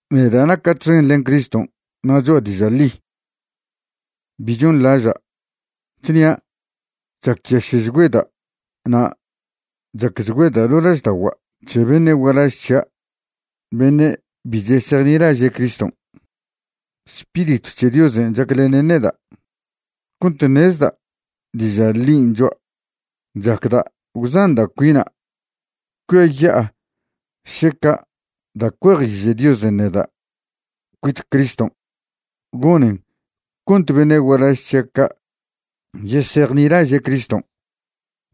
Neda' naca' txen len Criston' na' choa' diža' ḻi, bi chonḻaža', chnia' chacyaše'chgüeda' na' chacchgüeda' ḻo' lažda'ogua' c̱he beṉe' gualaž c̱hia' beṉe' bi chesejnilaže' Criston'. Spiritw c̱he Diosen' chaclenen neda' cont ṉezda' diža' ḻin' choa'. Chacda' gwzanda' cuina' cuiaya'a šeca' da' cuejiže' Diosen' neda' cuit Criston' gonen cont beṉe' gualaž c̱hia' ca' yesejnilaže' Criston'.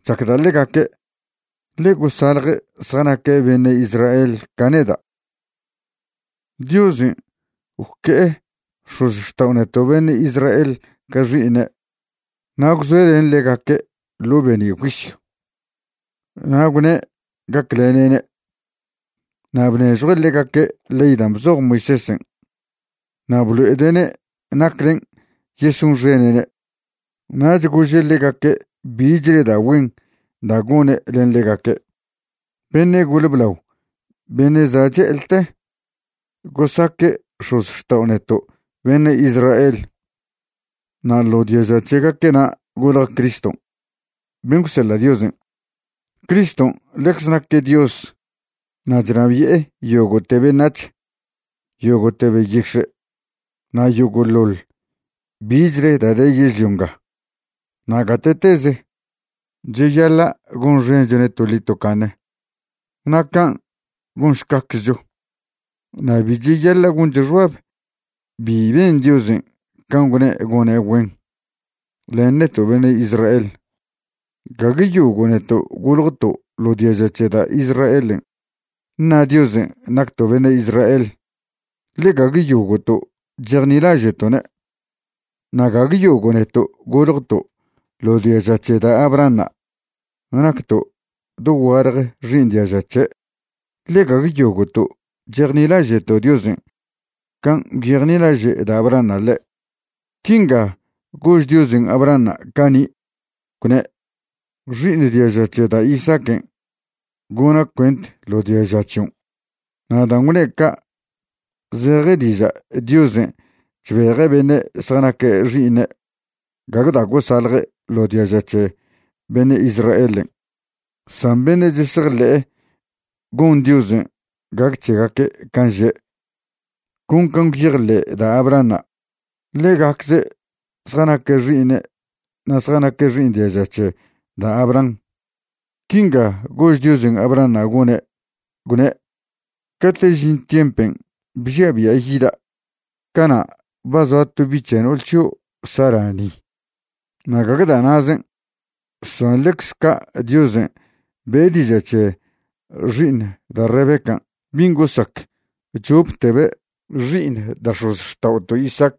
Chacda' ḻegaque', ḻe gosalje' zjanaque' beṉe' Israel ca neda'. Diosen' gwque'e x̱ozxtao' neto' beṉe' Israel ca xi'iṉe', na' gwzoe' len ḻegaque' ḻo' be'ni' juisyw. Na' gwne' gaclene'ne', na' bnežjue' ḻegaque' ley da' bzoj Moisésen'. Na' blo'ede'ne' naclen' yesonxene'ne', nach gože' ḻegaque' bichle da' güen da' gone' len ḻegaque'. Beṉe' gole blao beṉe' za' che'eḻte gosaque' x̱ozxtao' neto' beṉe' Israel. Na' ḻo diaža c̱hegaque'na' golje Criston' ben' gwseḻa' Diosen'. Criston' ḻecze naque' Dios na' chnabi'e yogo'te beṉac̱h, yogo'te beyix̱e' na' yogo'ḻoḻ bichle da' de yežlio nga na' gate'teze. Cheyaḻa' gonxenchone' toḻi tocaṉe. Na' can' gonšcaczcho. Na' bi cheyaḻa' goncho xbab bi ben Diosen' can' gwne' gone' güen len neto' beṉe' Israel. Gague yogo' neto' goljto' ḻo diaža c̱he da' Israelen' ṉa Diosen' nacto' beṉe' Israel, ḻe gague yogo'to' chejnilaže'to'ne'. Na' gague yogo' neto' goljto' ḻo diaža c̱he da' Abrahanṉa' nacto' dogualje xi'iṉ diaža c̱he', ḻe gague yogo'to' chejnilaže'to' Diosen' can' gwyejnilaže' da' Abrahanṉa' ḻe'. Quinga gož Diosen' Abrahanṉa' cani', gwne': “Xi'iṉ diaža c̱he da' Isaaquen' gona' cuent ḻo diaža c̱hion'.” Na' dan' gwne' ca' zeje diža' Diosen' chbeje' beṉe' zjanaque' xi'iṉe' gague da' gosalje' ḻo diaža c̱he beṉe' Israelen', san beṉe' chesejḻe'e gon Diosen' gac c̱hegaque' can' že' con can' gwyejḻe' da' Abrahanṉa', ḻegacze' zjanaque' xi'iṉe' na' zjanaque' xi'iṉ diaža c̱he da' Abraham. Quinga gož Diosen' Abrahanṉa' gone', gwne': “Cate' žin tiempen' bžia' bia' yida', cana' ba zoa to bi' c̱he no'ol c̱hio' Sara ni.” Na' gague da' na'zen', san ḻecz ca' Diosen' be'e diža' c̱he xi'iṉ da' Rebecan' bin' gosac choptebe' xi'iṉ da' x̱ozxta'oto' Isaac.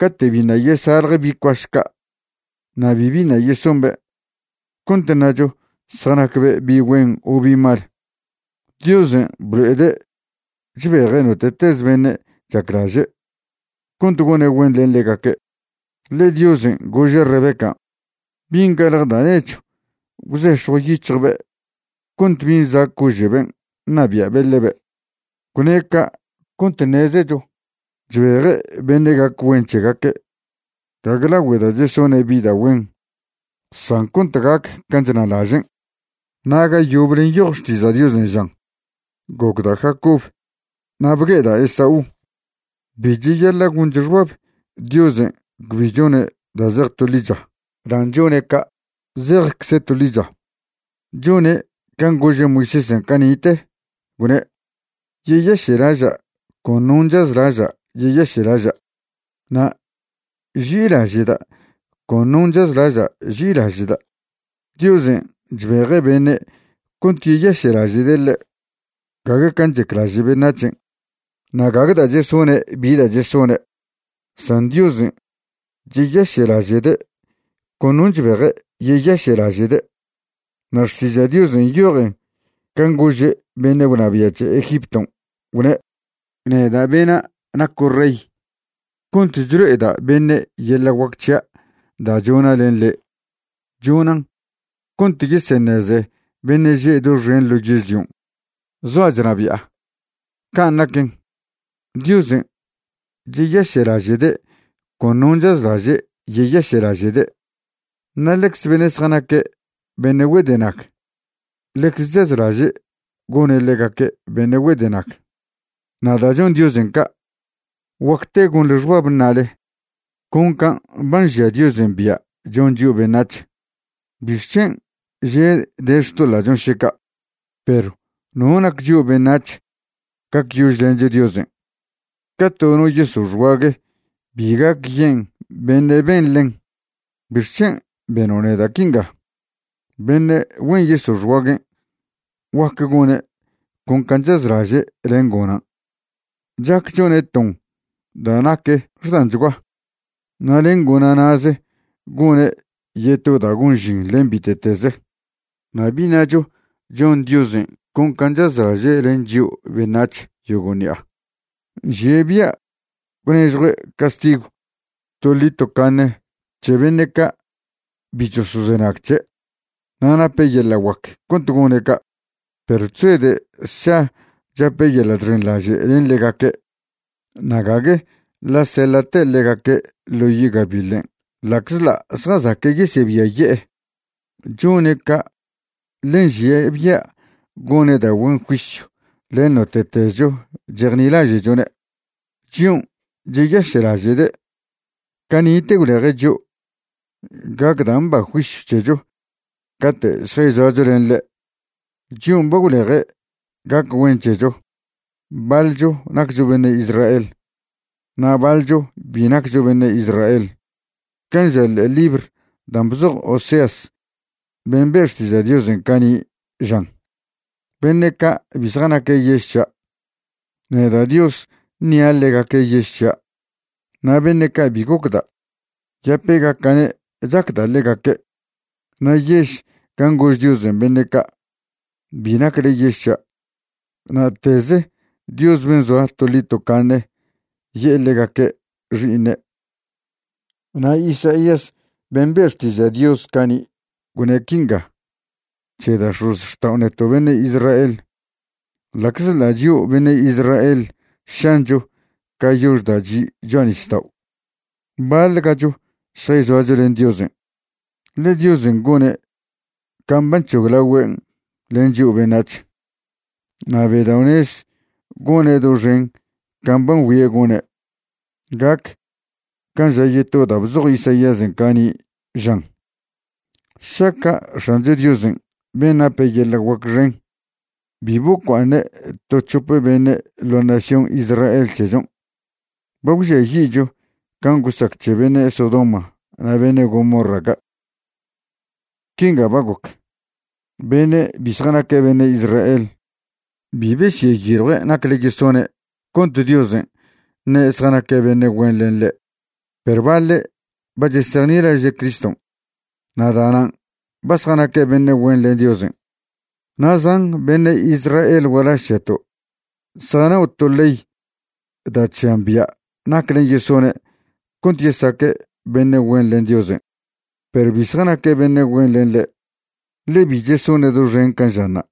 Cate' biṉa' yesalje bi' cuaš ca' na' bibi ṉa' yesombe' cont ṉacho zjanacbe' bi' güen o bi' mal, Diosen' blo'ede' chbeje' note'tez beṉe' chaclaže' cont gone' güen len ḻegaque'. Ḻe Diosen' gože' Rebecan': “Bin' galje da' nechw gwzex̱jw yic̱hjbe' cont bin' za' cože'ben' ṉabia'be' ḻebe'.” Gwne' ca' cont ṉezecho chbeje' beṉe' gac güen c̱hegaque', gague lagüe da' chesone' bi da' güen, san cont gac can' chnalažen'. Na' ga yoble nyoj Xtiža' Diosen' žan: “Gocda' Jacob na' bgue'eda' Esaú.” Bi cheyaḻa' goncho xbab Diosen' cbi chone' da' zej to ḻicha dan' chone' ca'. Zejcze' to ḻicha. Chone' can' gože' Moisésen' cani'te, gwne': “Yeyaše'laža' con non' chazlaža' yeyaše'laža', na' ži'ilaže'da' con non' chazlaža' ži'ilaže'da'.” Diosen' chbeje' beṉe' cont yeyaše'laže'de' ḻe', gague can' chaclaže' beṉac̱hen', na' gague da' chesone' bi da' chesone', san Diosen' cheyaše'laže'de' con non' chbeje' yeyaše'laže'de'. Na' Xtiža' Diosen' nyojen can' gože' beṉe' gwnabia' c̱he Egipton', gwne': “Neda' bena' naco' rey cont chlo'eda' beṉe' yeḻa' guac c̱hia' da' chona' len le'. Chonan' cont yeseṉeze beṉe' že' doxen ḻo yežlion' zoa' chnabi'a.” Can' naquen, Diosen' cheyaše'laže'de' con non' chazlaže' yeyaše'laže'de', na' ḻecze beṉe' zjanaque' beṉe' güedenag, ḻecze chazlaže' gone' ḻegaque' beṉe' güedenag. Na' da' chon Diosen' ca', guacte gonḻe xbab ṉale: “Con can' ba nžia Diosen' bia' chon chio' beṉac̱h. ¿Bixc̱hen' že' de xtoḻa'chon' še ca'?” Perw ¿no nac chio' beṉac̱h gacyožlencho Diosen'? Ca to no yeso' xguague bi gac yen' beṉe' ben ḻen: “¿Bixc̱hen' beno' neda' quinga?” Beṉe' güen yeso' xguaguen' guac gone' con can' chazlaže' len gonan'. Chac chone' ton da' nac xdanchgua na' len gona' na'ze gone' yeto da' gon žin len bite'teze. Na' bi ṉacho chon Diosen' con can' chazlaže' len chio' beṉac̱h yogo' ṉi'a, nžie' bia' gwnežjue' castigw toḻi tocaṉe c̱he beṉe' ca' bi chosozenag c̱he', na' nape' yeḻa' guac cont gone' ca'. Perw chzoede' sša chape' yeḻa' chxenḻaže' len ḻegaque' na' gague ḻa' seḻa'te' ḻegaque' ḻo yi' gabiḻen' ḻa'czḻa' zjazaque' yesebiaye'e. Chone' ca' ḻe nžie' bia' gone' da' güen juisyw len note'tezcho chejnilaže'chone', chion' cheyaše'laže'de'. Cani'te gwleje' chio' gac da' mba juisyw c̱hecho cate' šjayzoacho len ḻe'. Chion' ba gwleje' gac güen c̱hecho baḻcho naccho beṉe' Israel na' baḻcho bi naccho beṉe' Israel. Can' ža ḻe'e libr dan' bzoj Oseas ben' be' xtiža' Diosen' cani', žan: Beṉe' ca' bi zjanaque' yež c̱hia', neda' Dios ṉia' ḻegaque' yež c̱hia', na' beṉe' ca' bi gocda', yapegaca'ne' chacda' ḻegaque'. Na' yež gan' gož Diosen' beṉe' ca': “Bi nacle yež c̱hia'”, na'teze Dios ben' zoa toḻi tocaṉe ye'e ḻegaque' xi'iṉe'. Na' Isaías ben' be' xtiža' Dios cani' gwne' quinga c̱he da' x̱ozxtao' neto' beṉe' Israel: “Ḻa'czḻa' chio' beṉe' Israel šancho ca yox da' chi' cho'a nisdao', baḻ gacho šjayzoacho len Diosen'. Ḻe Diosen' gone' can' ba nc̱hoglagüen' len chio' beṉac̱h, na' bedao'nez gone' doxen can' ba ngüie' gone'.” Gac can' ža yeto da' bzoj Isaíasen' cani', žan: Šaca' X̱ancho Diosen' ben' nape yeḻa' guac xen bi bocua'aṉe' to c̱hope beṉe' ḻo nación Israel c̱hechon', ba gwžiayi'cho can' gosac c̱he beṉe' Sodoma na' beṉe' Gomorra ca'. Quinga ba goc, beṉe' bi zjanaque' beṉe' Israel bi besyeyiljue' nacle yesone' cont Diosen' ṉe' zjanaque' beṉe' güen len ḻe', perw baḻe' ba chesejnilaže' Criston' na' da'nan' ba zjanaque' beṉe' güen len Diosen'. Na' zan beṉe' Israel gualaž c̱heto' zjanao' to ley da' chžian bia' naclen' yesone' cont yesaque' beṉe' güen len Diosen'. Perw bi zjanaque' beṉe' güen len ḻe', ḻe bi chesone' doxen can' žanṉa'.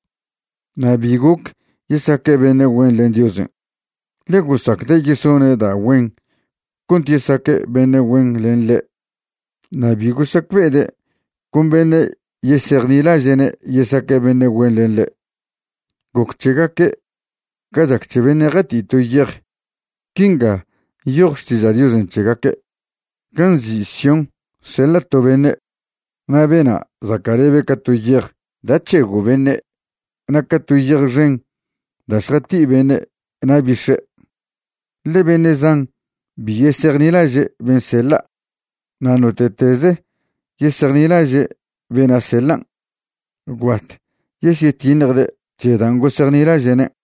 Na' bi goc yesaque' beṉe' güen len Diosen', ḻe gosacde' yesone' da' güen cont yesaque' beṉe' güen len ḻe' na' bi gosacbe'ede' con beṉe' yesejnilaže'ne' yesaque' beṉe' güen len ḻe'. Goc c̱hegaque' ca chac c̱he beṉe' jati'i to yej. Quinga nyoj Xtiža' Diosen' c̱hegaque': Gan' nzi' Sión seḻa' to beṉe', na' bena' zaca'lebe' ca to yej da' c̱hego' beṉe' na' ca to yej xen da' šjati'i beṉe' na' bix̱e', ḻe beṉe' zan bi yesejnilaže' ben' seḻa'. Na' note'teze' yesejnilaže' bena' seḻan', gwbat yesyetiṉjde' c̱he dan' gosejnilaže'ne'.